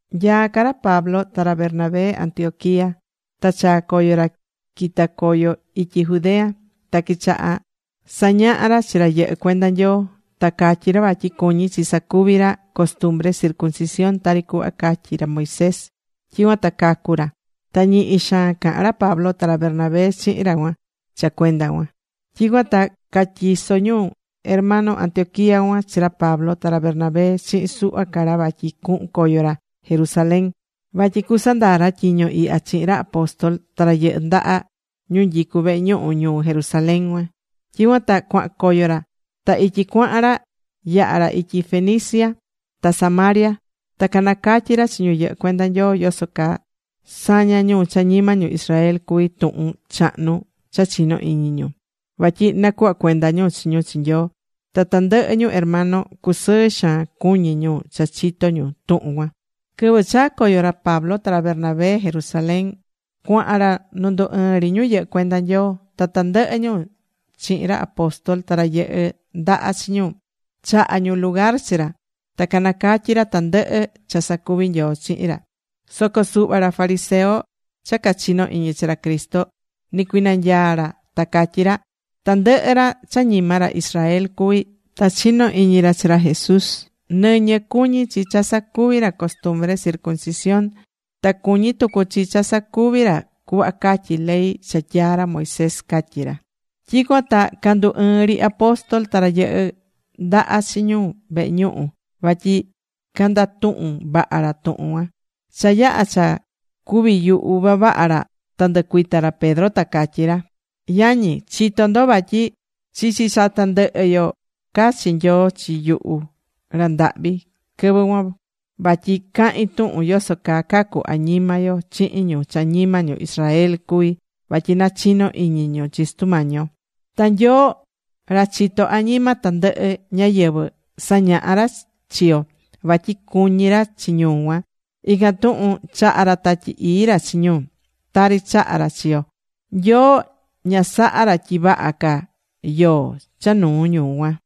Nyaá ca ra Pablo ta ra Bernabé Antioquía, ta chaa̱ coyo ra quita̱ coyo ityi Judea. Ta quichaha̱ sañahá ra chi ra yɨhɨ́ cuenda Nyoo. Ta catyí ra vatyi cuñí chi sacuvi ra costumbre circuncisión tari cuhva catyi̱ ra Moisés, tyicuan ta cacu ra. Ta ñihi xaan caha̱n ra Pablo ta ra Bernabé chihin ra cuan cha cuenda cuan. Tyicuan ta catyiso̱ ñu hermano Antioquía cuan chi ra Pablo ta ra Bernabé chihin suhva ca ra vatyi cuhun coyo ra Jerusalén. Vatyi cusandaa ra tyiño ihya chihin ra apóstol ta ra yɨhɨ́ ndaha ñu nyicu vehe ñuhu ñuu Jerusalén cuan. Tyicuan ta cuahan coyo ra. Ta ityi cuahan ra, yaha̱ ra ityi Fenicia ta Samaria. Ta canacatyi̱ ra chi ñu yɨhɨ́ cuenda Nyoo yoso caa sañá ñu cha ñima ñu Israel cuví tuhun chahnu cha chino̱ iñi ñu. Vatyi nacuhvá cuenda ñu chi ñu chi Nyoo. Ta tandɨhɨ ñu hermano cusɨɨ xaan cuñí ñu cha chitó ñu tuhun cuan. Quɨvɨ chaa̱ coyo ra Pablo ta ra Bernabé Jerusalén, cuahan ra nu ndu ɨɨn ri ñu yɨhɨ́ cuenda Nyoo. Ta tandɨhɨ ñu chihin ra apóstol, ta ra yɨhɨ ndaha chi ñu, chaha̱ ñu lugar chi ra. Ta canacatyi̱ ra tandɨhɨ cha sacuví Nyoo chihin ra. Soco suhva ra fariseo cha cachinó iñi chi ra Cristo, nicuinanyaa̱ ra ta catyí ra: ―Tandɨhɨ ra cha ñima ra Israel cuví ta chinó iñi ra chi ra Jesús, nɨñɨ cuñí chi cha sacuvi ra costumbre circuncisión. Ta cuñí tucu chi cha sacuví ra cuhva catyi ley cha tyaa̱ ra Moisés ―catyí ra. Tyicuan ta candu ɨɨ̱n ri apóstol ta ra yɨhɨ́ ndaha chi ñu vehe ñuhu vatyi candatuhun vaha ra tuhun cuan. Cha yaha̱ cha cuviyuhu vavaha ra ta ndɨcuita ra Pedro, ta catyí ra: ―Yañi, chitó ndo vatyi chichi cha tandɨhɨ yo cachi̱ Nyoo chi yuhu ra ndahvi quɨvɨ cuan, vatyi cahin tuhun yoso caa cacu añima yo chihin ñu cha ñima ñu Israel cuví, vatyi nachino iñi ñu chi Sutu Mañi yo. Ta Nyoo, ra chitó añima tandɨhɨ ñáyɨvɨ, sañaha̱ ra chi yo vatyi cuñí ra chi ñu cuan. Ican tuhun chaha̱ ra Tatyi Ii ra chi ñu, tari chaha̱ ra chi yo. Nyoo ña sahá ra tyi vaha ca yoó cha nuu ñu cuan.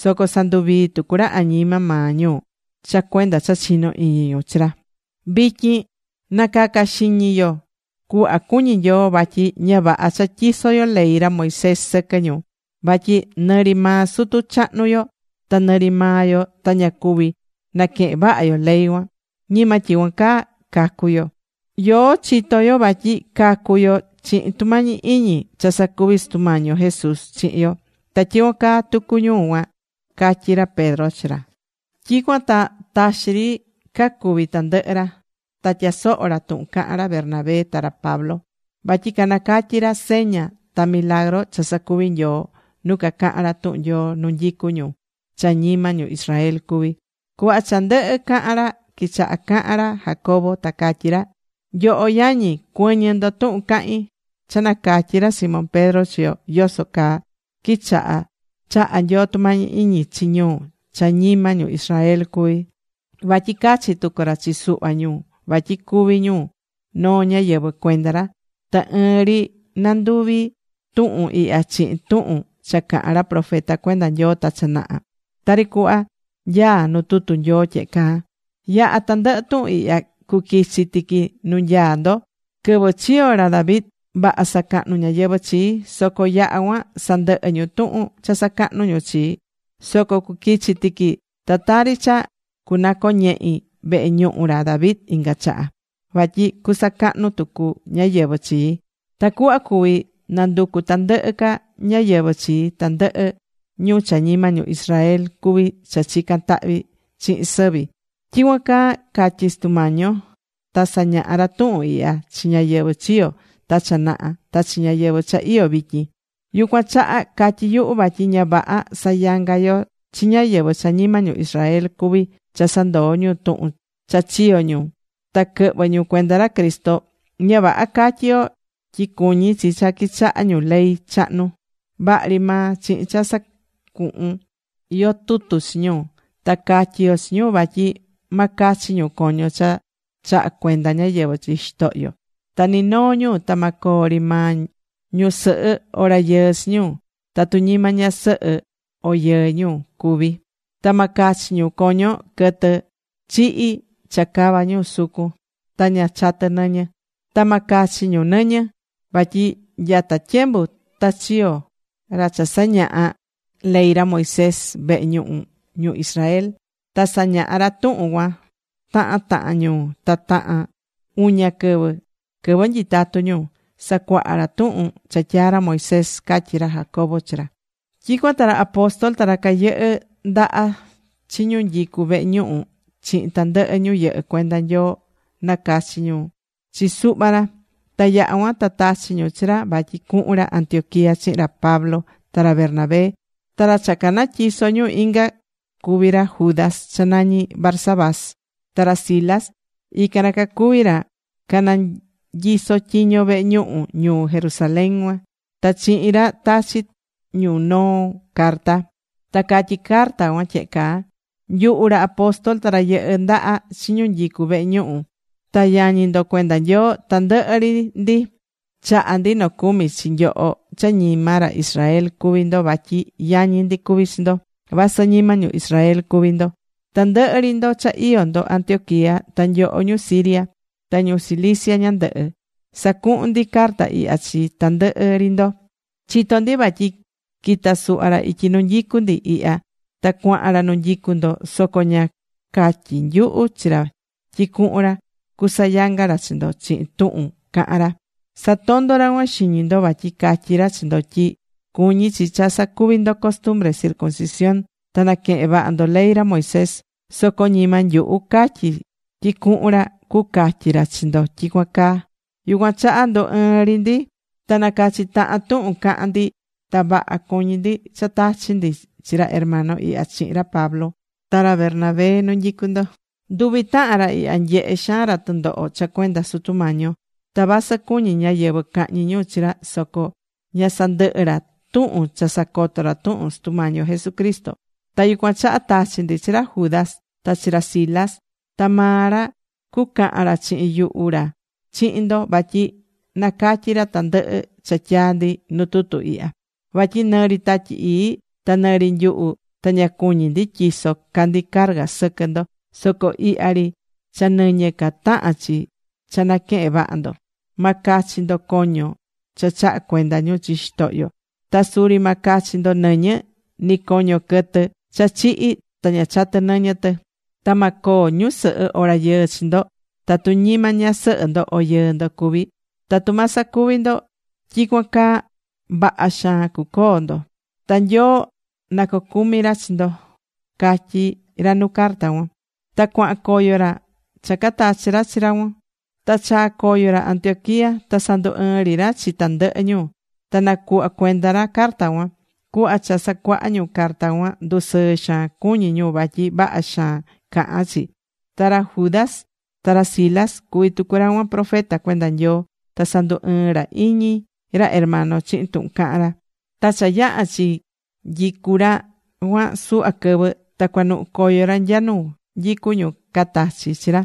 Soco sanduvií tucu ra añima maa ñu cha cuenda cha chinó iñi ñu chi ra. Vityin na̱caca xiñi yo cuhva cuñí Nyoo. Vatyi ña vaha cha tyisó yo ley ra Moisés sɨquɨ ñu. Vatyi nɨri maa sutu chahnu yo ta nɨri maa yo ta ña cuvi̱ naquehen vaha yo ley cuan. Ñima tyicuan caa cacú yo. Yoó chitó yo vatyi cacú yo chihin tumañi iñi cha sacuví Sutu Mañi yo Jesús chihin yo. Ta tyicuan caa tucu ñu cuan ―catyí ra Pedro chi ra. Tyicuan ta taxi ri cacuvi̱ tandɨhɨ ra. Ta tyasoho̱ ra tuhun cahan ra Bernabé ta ra Pablo. Vatyi canacatyi̱ ra seña ta milagru cha sacuvi̱ Nyoo nu cacaha̱n ra tuhun Nyoo nu nyicú ñu cha ñima ñu Israel cuví. Cuhva cha ndɨhɨ̱ cahan ra, quichaha cahan ra Jacobo, ta catyí ra: ―Nyoho yañi, cuɨ̱ñɨ ndo tuhun cahín. Cha nacatyi̱ ra Simón Pedro chi yo yoso caa quichaha chaha̱ Nyoo tumañi iñi chi ñu cha ñima ñu Israel cuví. Vatyi cachi̱ tucu ra chi suhva ñu vatyi cuvi ñu noo ñáyɨvɨ cuenda ra. Ta ɨɨn ri nanduvi tuhun ihya chihin tuhun cha caha̱n ra profeta cuenda Nyoo ta cha naha, tari cuhva nyaa nu tutu Nyoo tyehe caa: Yaha tandɨhɨ tuhun ihya cuquichi tiqui nu nyaá ndo. Quɨvɨ chiyo̱ ra David, vaha sacahnu̱ ñáyɨvɨ chii. Soco yaha̱ cuan sandɨhɨ ñu tuhun cha sacahnu ñu chii. Soco cuquichi tiqui ta tari cha cunacoñehi vehe ñuhu ra David inga chaha. Vatyi cusacahnu tucu ñáyɨvɨ chii. Tacuhva cuví nanducu tandɨhɨ ca ñáyɨvɨ chii, tandɨhɨ ñu cha ñima ñu Israel cuví cha chicán tahvi chihin sɨvi. Tyicuan caa catyi̱ Sutu Mañi yo ta sañaha̱ ra tuhun ihya chi ñáyɨvɨ chiyo̱ ta cha naha ta chi ñáyɨvɨ cha iyó vityin. ’Yucuan chaha catyí yuhu vatyi ña vaha sayanga yo chi ñáyɨvɨ cha ñima ñu Israel cuví cha sandoo ñu tuhun cha chiyo̱ ñu ta quɨhvɨ ñu cuenda ra Cristo. Ña vaha catyi yo tyi cuñí chi cha quichaha ñu ley chahnu. Vaha ri maa chihin cha sacuhun yo tutu chi ñu. Ta catyi yo chi ñu vatyi ma cachi ñu coño cha chaha̱ cuenda ñáyɨvɨ chi xitohyo. Ta ni noo ñu ta ma coo ri maa ñusɨhɨ o rayɨɨ chi ñu, tatu ñima ñasɨhɨ o yɨɨ ñu cuví. Ta ma cachi ñu coño quɨtɨ chihi̱ cha cava ñu sucun ta ña chatɨ nɨñɨ. Ta ma cachi ñu nɨñɨ. Vatyi nyata tyembu ta chiyo̱ ra cha sañahá ley ra Moisés vehe ñuhu ñu Israel ta sañaha ra tuhun cuan tahan tahan ñuu. Ta tahan uña quɨvɨ quɨvɨ nyitatú ñu, sacuaha ra tuhun cha tyaa̱ ra Moisés ―catyí ra Jacobo chi ra. Tyicuan ta ra apóstol ta ra cayɨhɨ ndaha chi ñu nyicú vehe ñuhu chihin tandɨhɨ ñu yɨhɨ́ cuenda Nyoo nacachi̱ ñu chi suhva ra. Ta yaha cuan ta tachi̱ ñu chi ra vatyi cuhun ra Antioquía chihin ra Pablo ta ra Bernabé. Ta ra cha canatyiso̱ ñu ican cuví ra Judas cha nañí Barsabás, ta ra Silas. Ican ra cacuví ra ra cananyisó tyiño vehe ñuhu ñuu Jerusalén cuan. Ta chihin ra tachi ñu noo carta. Ta catyí carta cuan tyehe caa: “Nyuhu ra apóstol, ta ra yɨhɨ ndaha chi ñu nyicú vehe ñuhu ta yañi ndo cuenda Nyoo, tandɨhɨ ri ndi chahá ndi nocumi chi nyoho cha ñima ra Israel cuví ndo vatyi yañi ndi cuví chi ndo vasɨ ñima ñu Israel cuví ndo. Tandɨhɨ ri ndo cha iyó ndo Antioquía ta nyoho ñu Siria, ta ñu Cilicia ñandɨhɨ, sacuhún ndi carta ihya chi tandɨhɨ ri ndo. Chitó ndi vatyi quita̱ suhva ra ityi nu nyicú ndi ihya. Ta cuahan ra nu nyicu ndo. Soco ña catyi̱ nyuhu chi ra tyi cuhun ra cusayanga ra chi ndo chihin tuhun cahan ra. Satondo̱ ra cuan xiñi ndo vatyi catyí ra chi ndo tyi cuñí chi cha sacuví ndo costumbre circuncisión ta naquehen vaha ndo ley ra Moisés. Soco ñima nyuhu catyi tyi cuhun ra cucatyi ra chi ndo tyicuan caa. Yucuan chaha ndu ɨɨ̱n ri ndi ta nacachi̱ tahan tuhun caha̱n ndi ta vaha cuñi̱ ndi cha tachi ndi chi ra hermano ihya chihin ra Pablo ta ra Bernabé nu nyicu ndo. Nduvi tahan ra ihya nyehé xaan ra tɨndoho cha cuenda Sutu Mañi yo. Ta vasɨ cuñí ñáyɨvɨ cahñi ñu chi ra soco ña sandɨhɨ ra tuhun cha sacoto ra tuhun Sutu Mañi yo Jesucristo. Ta yucuan chaha tachí ndi chi ra Judas ta chi ra Silas. Ta maa ra cucahan ra chihin yuhu ra chihin ndo, vatyi nacatyi ra tandɨhɨ cha tyaa̱ ndi nu tutu ihya. Vatyi nɨri Tatyi Ii ta nɨri nyuhu ta ña cuñí ndi tyiso ca ndi carga sɨquɨ ndo, soco ihya ri cha nɨñɨ ca tahán chi cha naquehen vaha ndo. Ma cachi ndo coño cha chaha̱ cuenda ñu chi xitohyo. Ta suri ma cachi ndo nɨñɨ, ni coño quɨtɨ cha chihi̱ ta ña chatɨ̱ nɨñɨ tɨ. Ta ma coo ñusɨhɨ o rayɨɨ chi ndo tatu ñima ñasɨhɨ ndo o yɨɨ ndo cuví. Tatu ma sacuvi ndo tyicuan caa, vaha xaan cuacoo ndo. Ta Nyoo na cocumi ra chi ndo”, catyí ra nu carta cuan. Ta cuahan coyo ra cha catachi ra chi cuan. Ta chaa̱ coyo ra Antioquía. Ta sandu ɨɨ̱n ri ra chi tandɨhɨ ñu, ta nacuhva̱ cuenda ra carta cuan. Cuhva cha sacuaha̱ ñu carta cuan ndusɨɨ xaan cuñí ñu vatyi vaha xaan cahán chi. Ta ra Judas ta ra Silas cuví tucu ra cuan profeta cuenda Nyoo. Ta sandunɨɨ̱ ra iñi ra hermano chihin tuhun caha̱n ra. Ta cha yaha̱ chinyicu ra cuan suhva quɨvɨ ta cuanuhu coyo ra nya nu nyicú ñu catachi chi ra.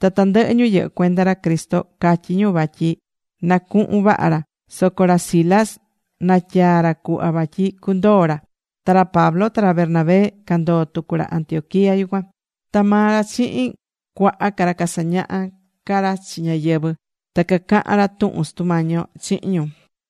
Ta tandɨhɨ ñu yɨhɨ cuenda ra Cristo catyi ñu vatyi na cuhun vaha ra. Soco ra Silas natyaa̱ ra cuhva vatyi cundoo ra. Ta ra Pablo ta ra Bernabé candoo̱ tucu ra Antioquía yucuan. Ta maa ra chihin cuaha ca ra casañaha̱ ca ra chi ñáyɨvɨ. Ta cacaha̱n ca ra tuhun Sutu Mañi yo chihin ñu.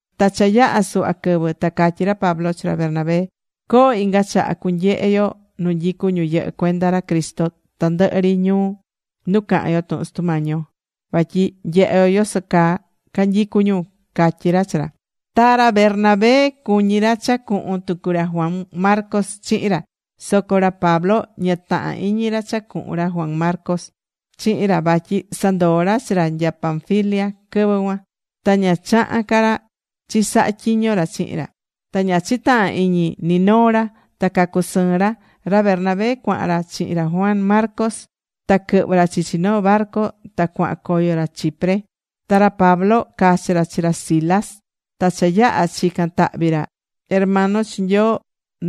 Ta cha yaha̱ suhva quɨvɨ ta catyí ra Pablo chi ra Bernabé: ―Co̱ho inga chaha cunyehe yo nu nyicú ñu yɨhɨ́ cuenda ra Cristo tandɨhɨ ri ñuu nu caha̱n yo tuhun Sutu Mañi yo. Vatyi nyehe yo yoso caa canyicu ñu ―catyí ra chi ra. Ta ra Bernabé cuñí ra cha cuhun tucu ra Juan Marcos chihin ra. Soco ra Pablo ña tahán iñi ra cha cuhun ra Juan chihin ra, vatyi sandoo̱ ra chi ra nya Panfilia quɨvɨ cuan. Ta ña chaha̱n ca ra chisaha tyiño ra chihin ra. Ta ña chitaha̱n iñi ni noo ra, ta cacusɨɨn ra. Ra Bernabé cuahan ra chihin ra Juan Marcos. Ta quɨhvɨ̱ ra chichi noo barcu ta cuahan coyo ra Chipre. Ta ra Pablo cachi̱ ra chi ra Silas. Ta cha yaha̱ chican tahvi ra hermano chi Nyoo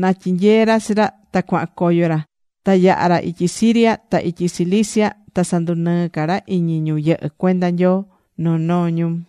na tyinyee ra chi ra, ta cuahan coyo ra. Ta yaha̱ ra ityi Siria, ta ityi Cilicia, ta sandunɨɨ́ ca ra iñi ñu yɨhɨ́ cuenda Nyoo noo noo ñuu.